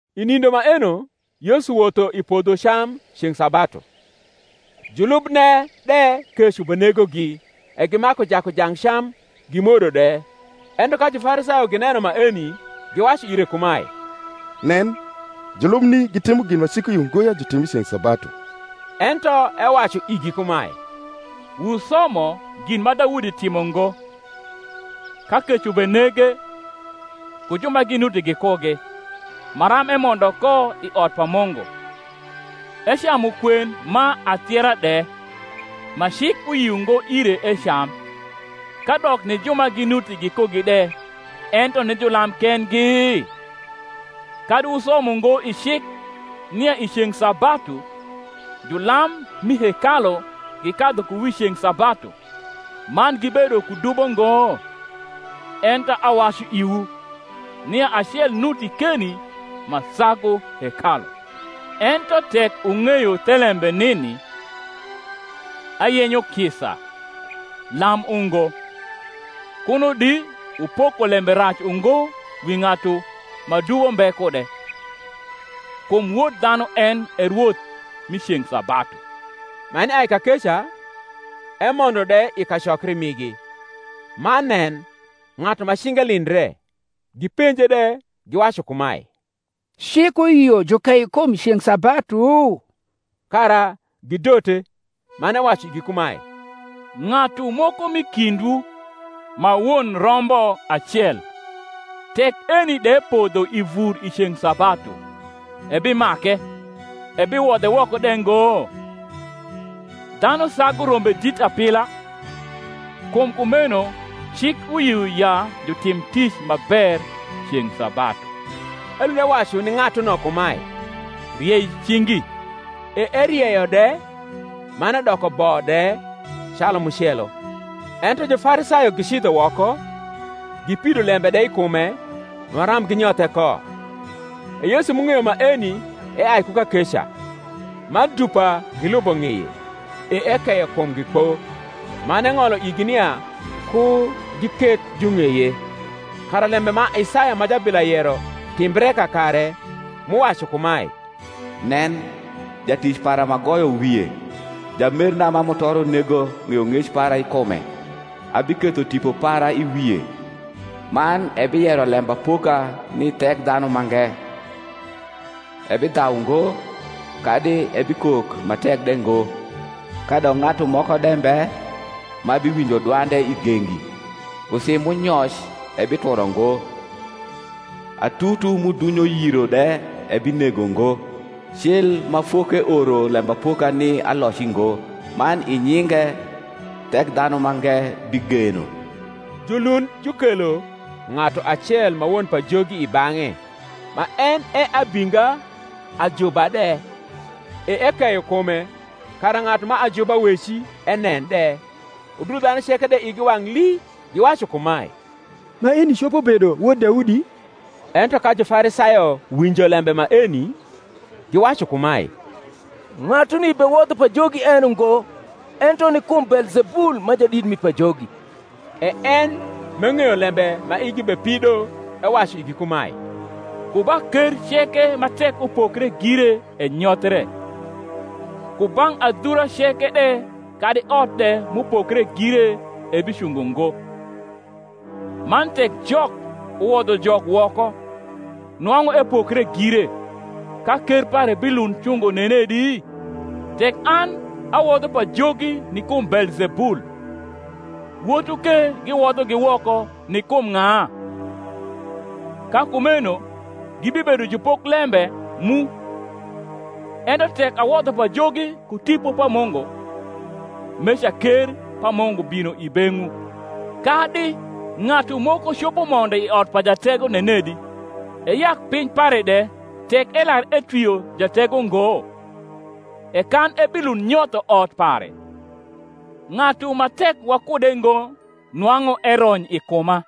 I nindo maeno Yesu wotho i podho cam ceng’ sabatu; julubne de kec ubenegogi e gimaku jaku jang cam gimwodo de. Ento ka Jufarisayo gineno maeni, giwacu ire kumae, Nen, julubni gitimo gin ma cik uyio ngo ya jutim i ceng’ sabatu. Ento ewacu igi kumae, Wusomo gin ma Daudi timo ngo, ka kec ubenege, ku ju ma ginuti gikugi; maram emondo ko i ot pa Mungu, ecamu kwen ma athiera de, ma cik uyio ngo ire ecam, kadok ni ju ma ginuti gikugi de, ento ni julam kendgi? Kadi wusomo ngo i cik, nia i ceng’ sabatu julam mi hekalu gikadhu ku wi ceng’ sabatu, man gibedo ku dubo ngo? Ento awacu iwu, nia acel nuti keni ma sagu hekalu. Ento tek wung’eyo thelembe nini, Ayenyo kisa, lam ungo, kuno di wupoko lembe rac ungo wi ng’atu ma dubo mbe kude. Kum Wod dhanu en e rwoth rni ceng’ sabatu. Man eai kakeca, emondo de i kacokri migi: man nen, ng’atu ma cinge lindre. Gipenje de, giwacu kumae, Cik uyio jukei kum ceng’ sabatu? kara gidote. Man ewacu igi kumae, Ng’atu moko m’i kindwu, ma won rombo acel, tek eni de podho i vur i ceng’ sabatu, ebimake, ebiwodhe woko de ngo? Dhanu sagu rombe dit apila! Kum kumeno cik uyio ya jutim tic ma ber ceng’ sabatu. Elund ewacu ni ng’atuno kumae, Riei cingi. E erieyo de; man edoko bo de, calu mucelo. Ento Jufarisayo gicidho woko, gipido lembe de i kume, maram ginyothe ko. E Yesu m’ung’eyo maeni eai ku kakeca: man dupa gilubo ng’eye; e ekeyo kumgi kpo, man eng’olo igi nia ku giketh jung’eye: kara lembe ma Isaya ma jablia yero timbre kakare, m’uwacu kumae, Nen, jatic para m’agoyo wie; Jamerna ma mutoro nego ng’eyong’ec para i kume: Abiketho Tipo para i wie, Man ebiyero lembapoka ni Thekdha numange. Ebidhau ngo, kadi ebikok ma tek de ngo; Kadok ng’atu moko de mbe ma biwinjo dwande i gengi. Usi m’unyoc ebituro ngo, Atutu m’udunyo yiro de ebinego ngo, Cil ma fok’eoro lembapoka ni aloci ngo. Man i nyinge Thekdhanumange bigeno. Julund jukelo ng’atu acel ma won pajogi i bang’e, ma en e abinga ajuba de: e ekeyo kume, kara ng’atu ma ajuba weci enen de. Udul dhanu ceke de igi wang’ lii, giwacu kumae, Maeni copo bedo wod Daudi? Ento ka Jufarisayo winjo lembe maeni, giwacu kumae, Ng’atuni bewodho pajogi en ungo, ento ni kum Beelzebul ma jadit mi pajogi. E en m’eng’eyo lembe ma igi bepido ewacu igi kumae, Ku ba ker ceke ma tek upokre gire enyothre; ku bang’ adhura ceke de kadi ot de m’upokre gire ebicungo ngo: man tek Jok uwodho Jok woko, nwang’u epokre gire; ka ker pare bilund cungo nenedi? Tek an awodho pajogi ni kum Beelzebul, wotwu ke giwodhogi woko ni kum ng’a? ka kumeno gibibedo jupoklembe mu. Ento tek awodho pajogi ku Tipo pa Mungu, meca ker pa Mungu bino i beng’wu. Kadi ng’atu moko copo mondo i ot pa jatego nenedi, eyak piny pare de, tek elar etwio jatego ngo? e kan ebilund nyotho ot pare. Ng’atu ma tek wakude ngo nwang’u erony i kuma;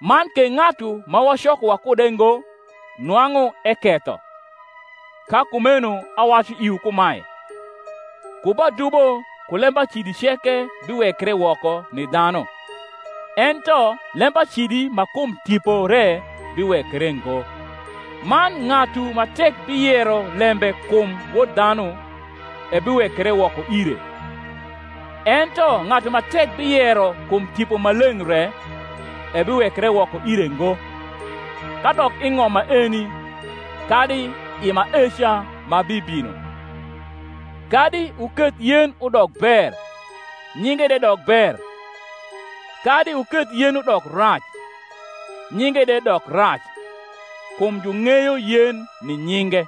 man ke ng’atu ma wacoko wakude ngo nwang’u eketho. Ka kumeno awacu iwu kumae, Ku ba dubo ku lembacidi ceke biwekre woko ni dhanu; ento lembacidi ma kum Tipo re biwekre ngo. Man ng’atu ma tek biyero lembe kum Wod dhanu, ebiwekre woko ire; ento ng’atu ma tek biyero kum Tipo Maleng’ re, ebiwekre woko ire ngo, kadok i ng’om maeni, kadi i maeca ma bibino. Kadi wuketh yen udok ber, nyinge de dok ber; kadi wuketh yen udok rac, nyinge de dok rac: kum jung’eyo yen ni nyinge.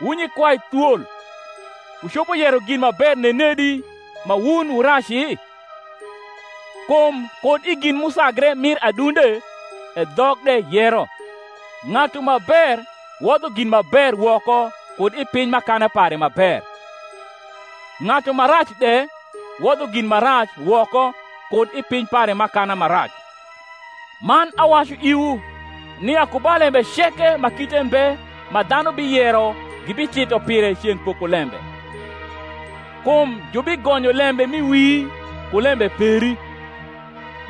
Wu nyikwai thwol, wucopo yero gin ma ber nenedi, ma wun wu raci? kum kud i gin m’usagre mir adunde e dhok de yero. Ng’atu ma ber wodho gin ma ber woko kud i piny m’akana pare ma ber: ng’atu ma rac de wodho gin ma rac woko kud i piny pare m’akana ma rac. Man awacu iwu, nia ku ba lembe ceke ma kite mbe ma dhanu biyero gibitito pire ceng’ pokolembe. Kum jubigonyo lembe m’i wii ku lembe peri,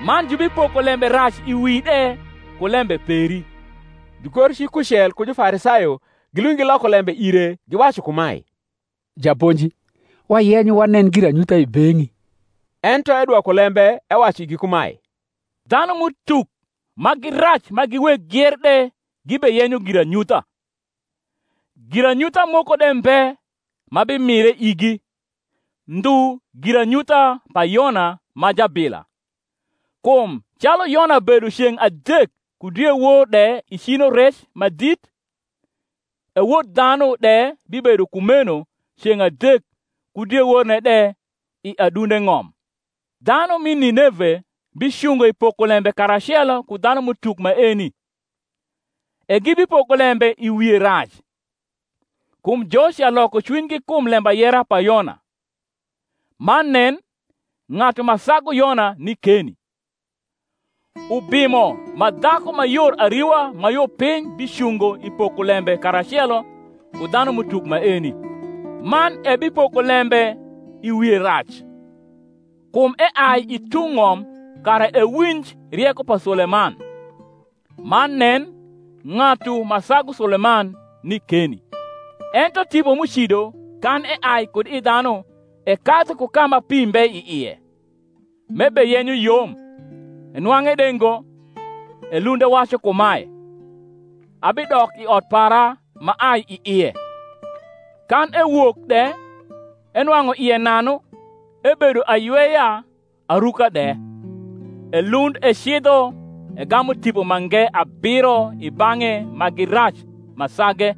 man jubipoko lembe rac i wii de ku lembe peri. Jugorcik kucel ku Jufarisayo gilund giloko lembe ire, giwacu kumae, Japonji, wayenyo wanen giranyutha i beng’i. Ento edwoko lembe ewacu igi kumae, Dhanum’utuk ma gi rac ma gi weg gier de gibeyenyo giranyutha; giranyutha moko de mbe ma bimire igi, ndhu giranyutha pa Yona ma jabila: kum calu Yona bedo ceng’ adek ku diewor de i cino rec ma dit; e Wod dhanu de bibedo kumeno ceng’ adek ku dieworne de i adunde ng’om. Dhanu mi Nineve bicungo i pokolembe karacelo ku dhanum’utuk maeni, e gibipoko lembe i wie rac; kum joca loko cwinygi kum lembayera pa Yona; man nen, ng’atu ma sagu Yona ni keni. Ubimo ma dhaku ma yor ariwa ma yo piny bicungo i pokolembe karacelo ku dhanum’utuk maeni, man ebipoko lembe i wie rac: kum eai i tung’ ng’om kara ewinj rieko pa Suleman; man nen, ng’atu ma sagu Suleman ni keni. Ento tipo m’ucido, kan eai kud i dhanu, ekadhu ku ka ma pi mbe i ie, m’ebeyenyo yom, enwang’e de ngo. Elund ewacu kumae, Abidok i ot para m’aai i ie; kan ewok de, enwang’u ie nanu, ebedo ayweya, aruka de. Elund ecidho, egamu tipo mange abiro i bang’e ma gi rac ma sage,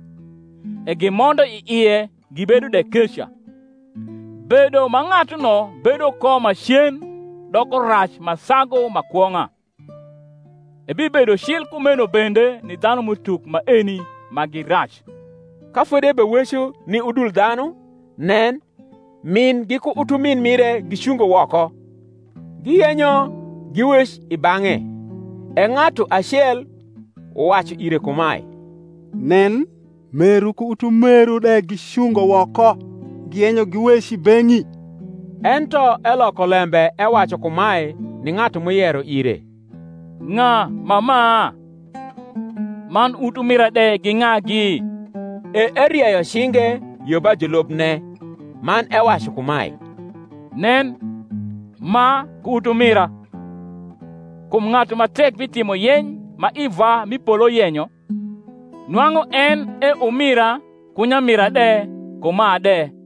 e gimondo i ie gibedo de keca: bedo ma ng’atuno bedo ko macen doko rac ma sagu ma kwong’a. Ebibedo cil kumeno bende ni dhanum’utuk maeni ma gi rac. Ka fodi ebeweco ni udul dhanu, nen, min giku utumin mire gicungo woko, giyenyo giwec i bang’e. E ng’atu acel uwacu ire kumae, Nen, meru ku utumeru de gicungo woko, giyenyo giwec i beng’i. Ento eloko lembe ewacu kumae, ni ng’atu m’uyero ire, Ng’a ma ma? man utumira de gi ng’agi? E erieyo cinge yo ba julubne, man ewacu kumae, Nen, ma ku utumira! Kum ng’atu ma tek bitimo yeny ma i Vwa m’i polo yenyo, nwang’u en e umira, ku nyamira de, ku ma de.